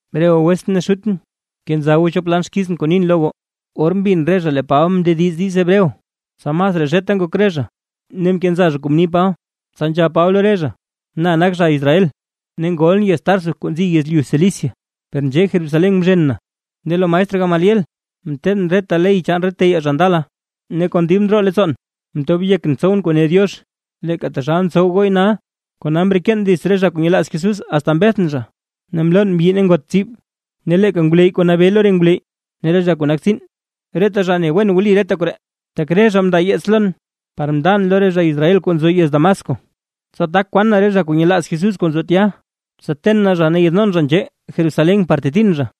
―Re goo wetsʼn ne xutʼn, kenza goo chop lan xkizʼn kuu nin lo goo. Or mbin re zha lee Paba mndediz diiz Hebreo, tsa masraa zheta ngok re zha ne mkenza zha kuu mni Paba, tsa nzhab Paba lo re zha: ―Na nak zha Israel, ne ngolʼn yez Tarso kuu nzi yezlyu Cilicia, per nzhee Jerusalén mzhen na ne lo maestr Gamaliel mteedʼn reta ley chaan re teyaa zha ndala. Ne kon dib ndroo leettsoon mtob yekʼn tsowʼn kuu ne Diox, leeka taxal ntsow gooy nal. Kona mreken dits re zha kuu nyelaaz Jesús asta mbethʼn zha, ne mlon mbyi ne ngot tsib. Ne leeka ngwleyy kuu nabee lo re ngwleyy ne re zha kuu nak tsiin, reta zha ne wen wli reta koree, tak re zha mndaa yeets lon par mndan lo re zha Israel kuu nzo yez Damasco, tsa tak kwan na re zha kuu nyelaaz Jesús kuu nzo tya, tsa ten na zha ne yaadnon zha nzhee Jerusalén par tetin zha.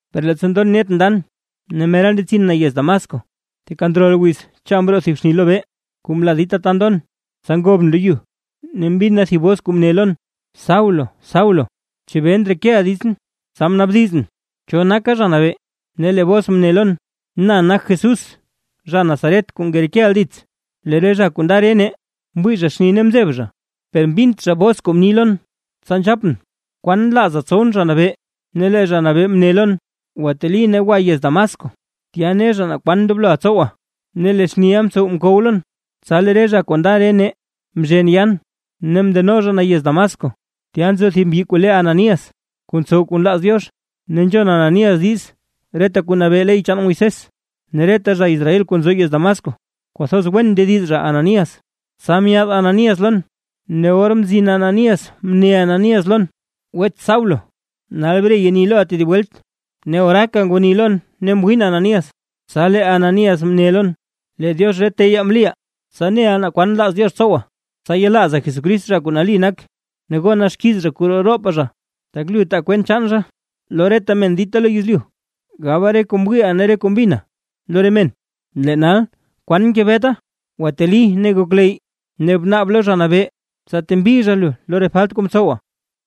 ’Per leettsa ndon net ndan ne mera ndetsin na yez Damasco, teeka ndrol wiz cha mroo thib xni lobee kuu mlaa dita ta ndon, tsa ngobʼn lo yu. Ne mbin na thib bos kuu mne lon: “Saulo Saulo, ¿chebee ndrekeʼa ditsʼn?” Tsa mnaabdizʼn: “¿Cho naka Zha Nabee?” Ne lee bos mne lon: “Na nak Jesús zha Nazaret kuu ngerekeʼa dits”. Lee re zha kuu nda re nee, mwii zha xni ne mzeb zha, per mbint zha bos kuu mni lon. Tsa nzhapʼn: “¿Kwan nlaaza tsowʼn Zha Nabee?” Ne lee Zha Nabee mne lon: “Gwateli ne gwaka yez Damasco, tya ne zha naa kwan ndobloʼa tsowa”. Ne lee xniʼa mtsow mkow lon, tsa lee re zha kuu nda re nee mzhen yaan ne mndeno zha na yez Damasco. ’Tya nzo thib mbyi kuu le Ananías kuu ntsow kuu nlaaz Diox, ne nzhon Ananías diiz reta kuu nabee ley chaan Moisés, ne reta zha Israel kuu nzo yez Damasco kwathoz wen ndediz zha Ananías. Tsa myaad Ananías lon, ne or mzin Ananías mne Ananías lon: “Wets Saulo, nal bre yeni loʼa tedib welt”. Ne oraaka ngwani lon ne mwiin Ananías. Tsa lee Ananías mne lon, lee Diox re teyaa mliʼa, tsa neʼa naa kwan nlaaz Diox tsowa, tsa yelaaza Jesucrist zha kuu nali nak, ne gona xkiiz zha kuu roo roopa zha. Tak lu taa kwent chaan zha lo reta men dita lo yezlyu, gaba re kuu mwiiʼa ne re kuu mbina lo re men. Lee nal, ¿kwan ngebeta? Gwateli ne gokleyy ne bnaab lo Zha Nabee, tsa tembi zha lu lo re falt kuu mtsowa.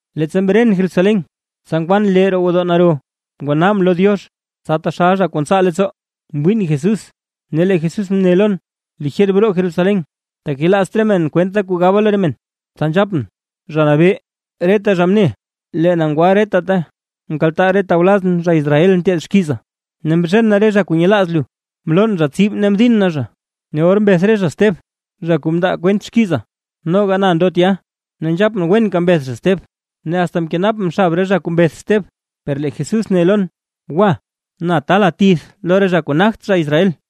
’Leettsa mren Jerusalén, tsa ngwan lee roo gwodoo naro ngwanaabʼn lo Diox, tsa taxal zha kuu ntsaa leettsoo. Mwiin Jesús ne lee Jesús mne lon: “Lijer broo Jerusalén, tak yelaazt re men kwentʼda kuu gaba lo re men”. Tsa nzhapʼn: “Zha Nabee, reta zha mne lee na ngwa reta ta nkaltaa re tawlazʼn zha Israel nteed xkiza, ne mzhen na re zha kuu nyelaaz lu, mlon zha tsib ne mdin na zha. Ne or mbeth re zha Steb, zha kuu mndaa kwent xkiza, noga na ndo tya, ne nzhapʼn wenka mbeth zha Steb, ne asta mkenapʼn xab re zha kuu mbeth Steb.” Per lee Jesús ne lon: “Gwa, na taala tith lo re zha kuu nagt zha Israel”.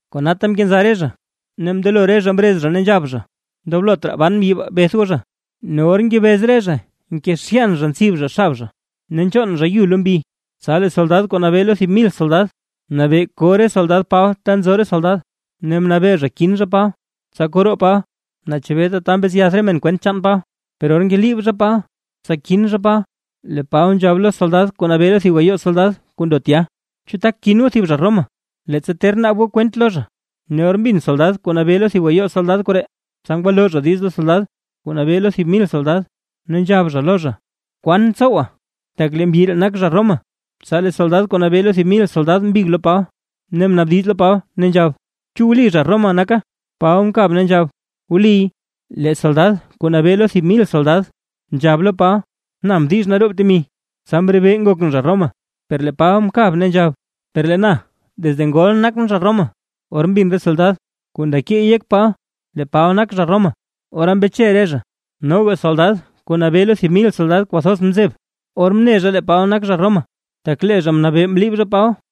Konata mkenza re zha, ne mndelo re zha mrez zha ne nzhab zha: ―¡Ndoblot raa ban mbyi baa! ¡Beth goo zha! Ne or ngebez re zha nkezhyan zha ntsib zha xab zha ne nchoon zha yu lo mbi, tsa lee soldad kuu nabee lo thib mil soldad, mnabee ko re soldad Paba ta nzo re soldad, ne mnabee zha kin zha Paba, tsa koo roo Paba naa chebee tata mbetsyath re men kwent chaan Paba. Per or ngeliib zha Paba tsa kin zha Paba, lee Paba nzhab lo soldad kuu nabee lo thib gayoo soldad kuu ndo tya: ―¿Chu tak kin goo thib zha Roma, leettsa ter naab goo kwent lo zha? Ne or mbin soldad kuu nabee lo thib gayoo soldad koree, tsa ngwalo zha diiz lo soldad kuu nabee lo thib mil soldad, ne nzhab zha lo zha: ―¿Kwan tsowa? Tak lee mbyi ree nak zha Roma. Tsa lee soldad kuu nabee lo thib mil soldad mbig lo Paba ne mnaabdiz lo Paba nzhab: ―Chu wli zha Roma naka. Paba mkab ne nzhab: ―Wliy. Lee soldad kuu nabee lo thib mil soldad nzhab lo Paba: ―Na mdix naroob temi tsa mrebee ngokʼn zha Roma. Per lee Paba mkab ne nzhab: ―Per lee na desde ngolʼn nakʼn zha Roma. Or mbin re soldad kuu nda keey yek Paba lee Paba nak zha Roma, ora mbeche re zha, noga soldad kuu nabee lo thib mil soldad kwathoz mzeb, or mne zha lee Paba nak zha Roma, tak lee zha mnabee mliib zha Paba.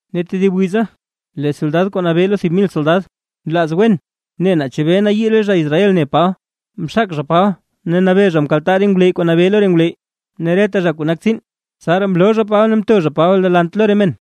Ne tedib wiza lee soldad kuu nabee lo thib mil soldad, nlaaz wen ne naa chebee nayii re zha Israel ne Paba, mxak zha Paba ne mnabee mkaltaa re ngwleyy kuu nabee lo re ngwleyy ne reta zha kuu nak tsiin. Tsaraa mloo zha Paba ne mto zha Paba delant lo re men.